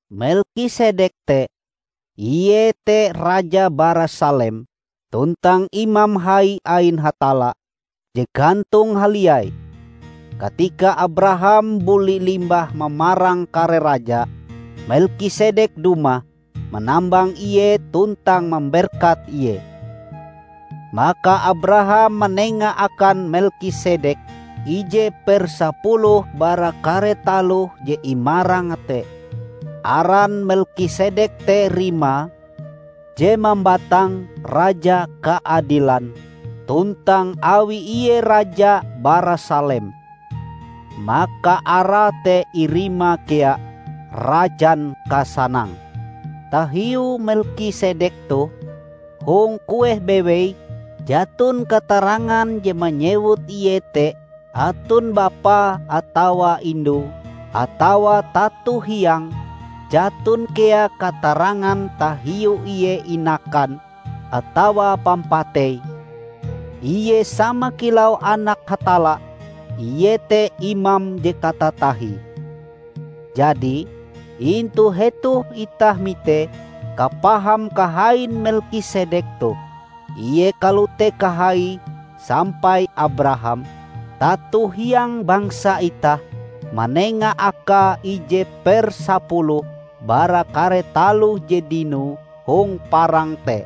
Melkisedek te, iete raja bara Salem tuntang imam hai ain Hatalla je gantong haliai. Katika Abraham buli limbah mamarang kare raja, Melkisedek dumah manambang ie tuntang mamberkat ie. Maka Abraham manenga akan Melkisedek ije per sapuluh bara kare taloh je imarange te. (Aran Melkisedek te rimae, je mambatang "Raja Kaadilan"; tuntang awi ie raja bara Salem, maka arae te irima kea "Rajan Kasanang".) Tahiu Melkisedek toh, hong kueh bewei jaton katarangan je manyewut ie te aton bapae atawa indue atawa tato hiange; jaton kea katarangan tahiu ie inakan, atawa pampateie. Ie sama kilau Anak Hatalla; ie te imam je katatahie. Jadi, intu hetoh itah mitee kapaham kahain Melkisedek toh; ie kalote kahaie sampai Abraham, tato hiang bangsa itah, manenga akae ije per sapuluh bara kare taloh je dinoe hong parang te.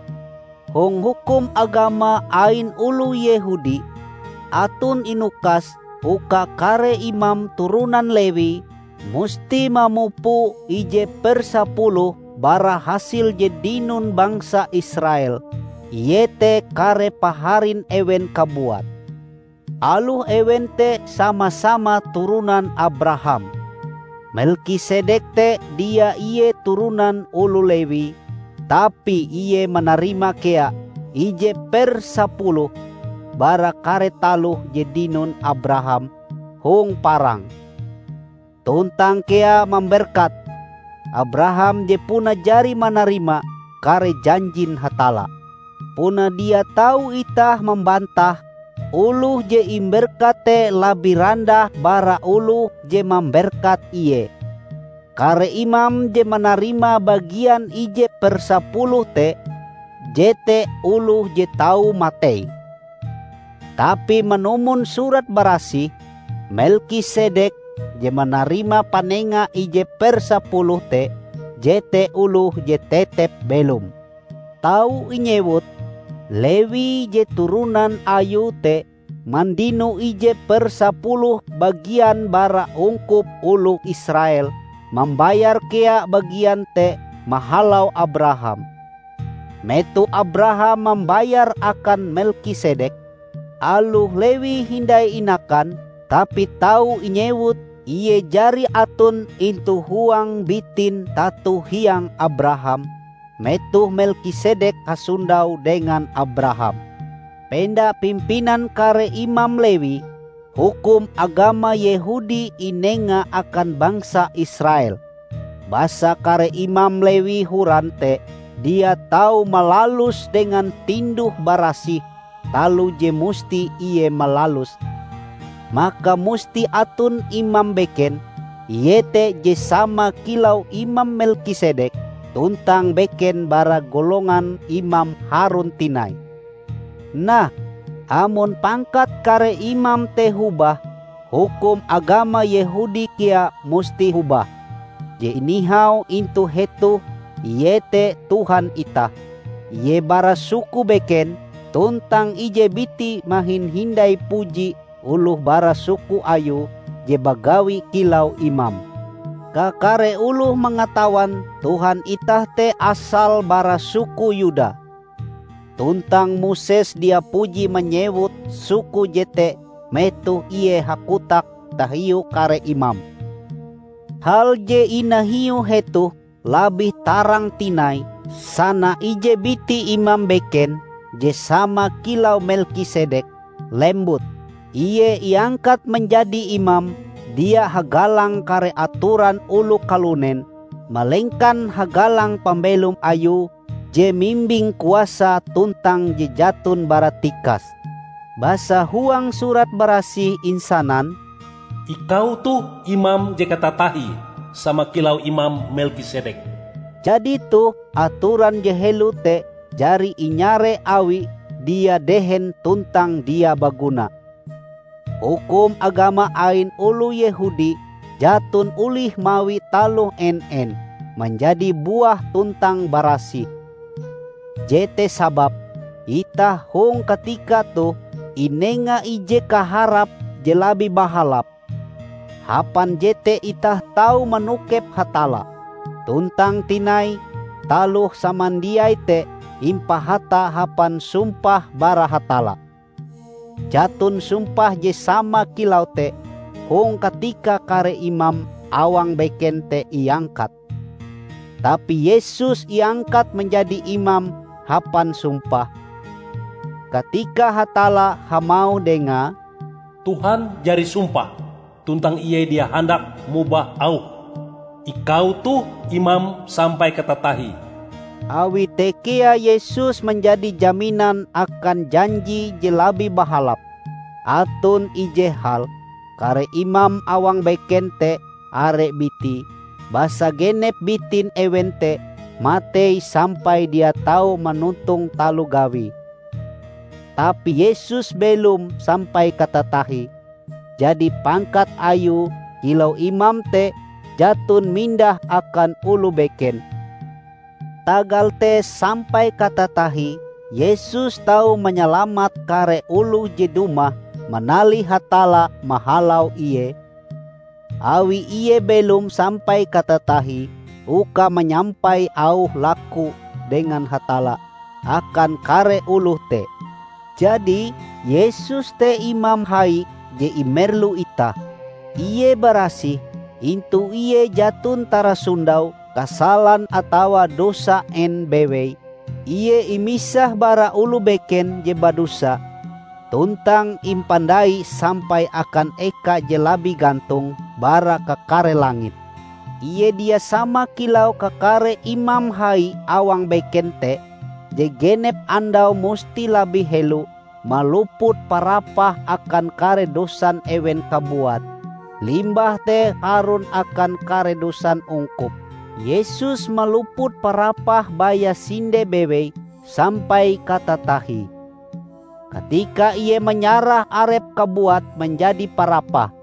Hong hukum agama ain oloh Yehudi, aton inukas uka kare imam turonan Lewi musti mamupo ije per sapuluh bara hasil je dinon bangsa Israel, iete kare paharin ewen kabuat, aloh ewen te sama-sama turonan Abraham. Melkisedek te dia ie turonan oloh Lewi, tapi ie manarima kea ije per sepuluh bara kare taloh je dinon Abraham hong parang, tuntang kea mamberkat Abraham je puna jari manarima kare janjin Hatalla. Puna dia tau itah mambantahe, oloh je imberkat te labih randah bara oloh je mamberkat ie. Kare imam je manarima bagian ije per sapuluh te, jete oloh je tau matei. Tapi manumon Surat Barasih, Melkisedek je manarima panenga ije per sapuluh te, jete oloh je tetep belom. Tau inyewut, Lewi -- je turonan ayue te mandino ije per sapuluh bagian bara ungkup oloh Israel -- mambayar kea bagian te mahalau Abraham, metoh Abraham mambayare akan Melkisedek. Aloh Lewi hindai inakan, tapi tau inyewut ie jari aton intu huang bitin tato hiange Abraham, metoh Melkisedek hasondau dengan Abraham. Penda pimpinan kare imam Lewi, hukum agama Yehudi inenga akan bangsa Israel. Basa kare imam Lewi horan te dia tau malalus dengan tinduh-barasih taloh je musti ie malaluse, maka musti aton imam beken, iete je sama kilau imam Melkisedek, tuntang beken bara golongan imam Harun tinai! Nah, amon pangkat kare imam te hobah, hukum agama Yehudi kea musti hobah. Je inahiu intu hetoh iete Tuhan itah: ie bara suku beken, tuntang ije biti mahin hindai puji oloh bara suku Ayue je bagawi kilau imam. Kakare oloh mangatawan Tuhan itah te asale bara suku Yuda; tuntang Moses dia puji manyewut suku jete metoh ie hakotak tahiu kare imam. Hal je inahiu hetoh labih tarang tinai, sana ije biti imam beken je sama kilau Melkisedek, lembut. Ie iangkat manjadi imam, dia hagalang kare atoran oloh kalunen, malengkan hagalang pambelom Ayue je mimbing kuasa tuntang je jaton baratikas. Basa huang Surat Barasih insanan, "Ikau toh imam je katatahie, sama kilau imam Melkisedek." Jadi toh, atoran je helo te jari inyare awi dia dehen tuntang dia baguna. Hukum agama ain oloh Yehudi jaton olih mawi taloh en-en manjadi buah tuntang barasih. Jete sababe itah hong katika toh inenga ije kaharap je labih bahalap; hapan jete itah tau manokep Hatalla. Tuntang tinai, taloh samandiai te impahata hapan sumpah bara Hatalla. Jaton sumpah je sama kilau te hong katika kare imam awang beken te iangkat. Tapi Yesus iangkat manjadi imam hapan sumpah, katika Hatalla hamauh dengae, "Tuhan jari sumpah, tuntang Ie dia handak mobah Auhe, 'Ikau toh imam sampai katatahie.' " Awi te kea Yesus manjadi jaminan akan janji je labih bahalap. Aton ije hal: Kare imam awang beken te are bitie, basa genep bitin ewen te matei sampai dia tau manontong taloh gawie. Tapi Yesus belom sampai katatahie, jadi pangkat Ayue kilau imam te jaton mindah akan oloh beken. Tagal te sampai katatahie Yesus tau manyalamat kare oloh je dumah manalih Hatalla mahalau Ie, awi ie belom sampai katatahie uka manyampai auh laku dengan Hatalla akan kare oloh te. Jadi, Yesus te Imam Hai je imerlu itah. Ie barasih; intu Ie jaton tarasondau kasalan atawa dosa en bewei. Ie imisah bara oloh beken je badosa, tuntang impandai sampai akan eka je labih gantong bara kakare langit. Ie dia sama kilau kakare imam hai awang beken te, je genep andau musti labih helo maluput parapah akan kare dosan ewen kabuat, limbah te harun akan kare dosan ungkup. Yesus maluput parapah baya sinde bewei sampai katatahie, katika Ie manyarah Arepe kabuat manjadi parapah.